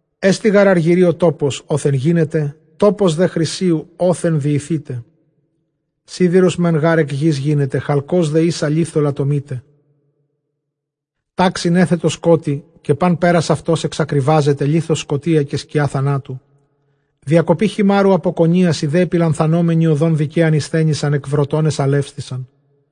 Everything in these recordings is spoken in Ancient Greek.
Ἐστι γὰρ ἀργυρίῳ τόπος ὅθεν γίνεται, τόπος δὲ χρυσίου ὅθεν διηθεῖται. Σίδηρος μὲν γὰρ ἐκ γῆς γίνεται, χαλκὸς δὲ ἶσα λίθῳ λατομεῖται. Τάξιν ἔθετο σκότει, καὶ πᾶν πέρας αὐτὸς ἐξακριβάζεται, λίθος σκοτία, καὶ σκιὰ θανάτου. Διακοπὴ χειμάῤῥου ἀπὸ κονίας, οἱ δὲ ἐπιλανθανόμενοι ὁδὸν δικαίαν ἠσθένησαν, ἐκ βροτῶν ἐσαλεύθησαν.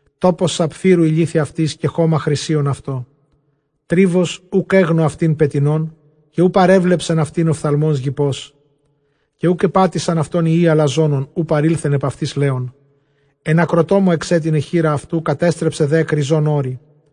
Τόπος σαπφείρου οἱ λίθοι αὐτῆς, καὶ χῶμα χρυσίον αὐτῷ. Τρίβος, οὐκ ἔγνω αὐτὴν πετεινὸν, καὶ οὐ παρέβλεψεν αὐτὴν ὀφθαλμὸς γυπός· Καὶ οὐκ ἐπάτησαν αὐτὸν υἱοὶ ἀλαζόνων, οὐ παρῆλθεν ἐπʼ αὐτῆς λέων. Ἐν ἀκροτόμῳ ἐξέτεινε χεῖρα αὐτοῦ, κατέστρεψε δὲ ἐκ ῥιζῶν ὄρη.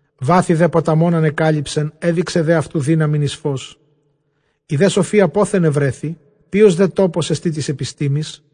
Βάθη δὲ ποταμῶν ἀνεκάλυψεν, ἔδειξε δὲ αὐτοῦ δύναμιν εἰς φῶς. Ἡ δὲ σοφία πόθεν εὑρέθη; ποῖος δὲ τόπος ἐστὶ τῆς ἐπιστήμης;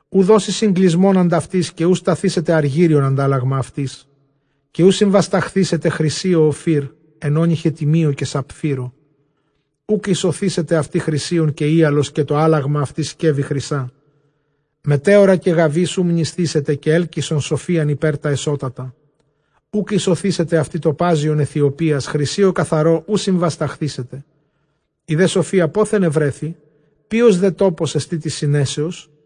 Οὐ δώσει συνκλεισμὸν ἀντʼ αὐτῆς, καὶ οὐ σταθήσεται ἀργύριον ἀντάλλαγμα αὐτῆς. Καὶ οὐ συνβασταχθήσεται χρυσίῳ Σωφεὶρ, ἐν ὄνυχι τιμίῳ καὶ σαπφείρῳ. Οὐκ ἰσωθήσεται αὐτῇ χρυσίον καὶ ὕαλος, καὶ τὸ ἄλλαγμα αὐτῆς σκεύη χρυσᾶ. Μετέωρα καὶ γαβὶς οὐ μνησθήσεται, καὶ ἕλκυσον σοφίαν ὑπὲρ τὰ ἐσώτατα. Οὐκ ἰσωθήσεται αὐτῇ τοπάζιον Αἰθιοπίας, χρυσίῳ καθαρῷ οὐ συμβασταχθήσεται. Ἡ δὲ σοφία πόθεν εὑρέθη; ποῖος δὲ τόπος ἐστὶ τῆς συνέσεως;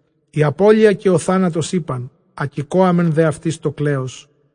Ἡ ἀπώλεια καὶ ὁ θάνατος εἶπαν, ἀκηκόαμεν δὲ αὐτῆς τὸ κλέος.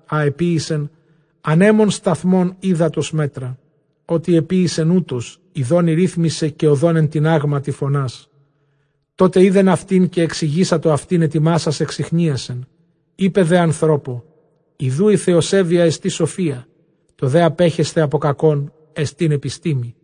ἃ ἐποίησεν, ἀνέμων σταθμὸν, ὕδατος μέτρα ὅτε ἐποίησεν· οὕτως ἰδὼν ἠρίθμησε, καὶ ὁδὸν ἐν τινάγματι φωνάς. Τότε εἶδεν αὐτὴν, καὶ ἐξηγήσατο αὐτὴν, ἑτοιμάσας ἐξιχνίασεν. Εἶπε δὲ ἀνθρώπῳ, Ἰδοὺ ἡ θεοσέβειά ἐστι σοφία, τὸ δὲ ἀπέχεσθαι ἀπὸ κακῶν ἐστὶν ἐπιστήμη.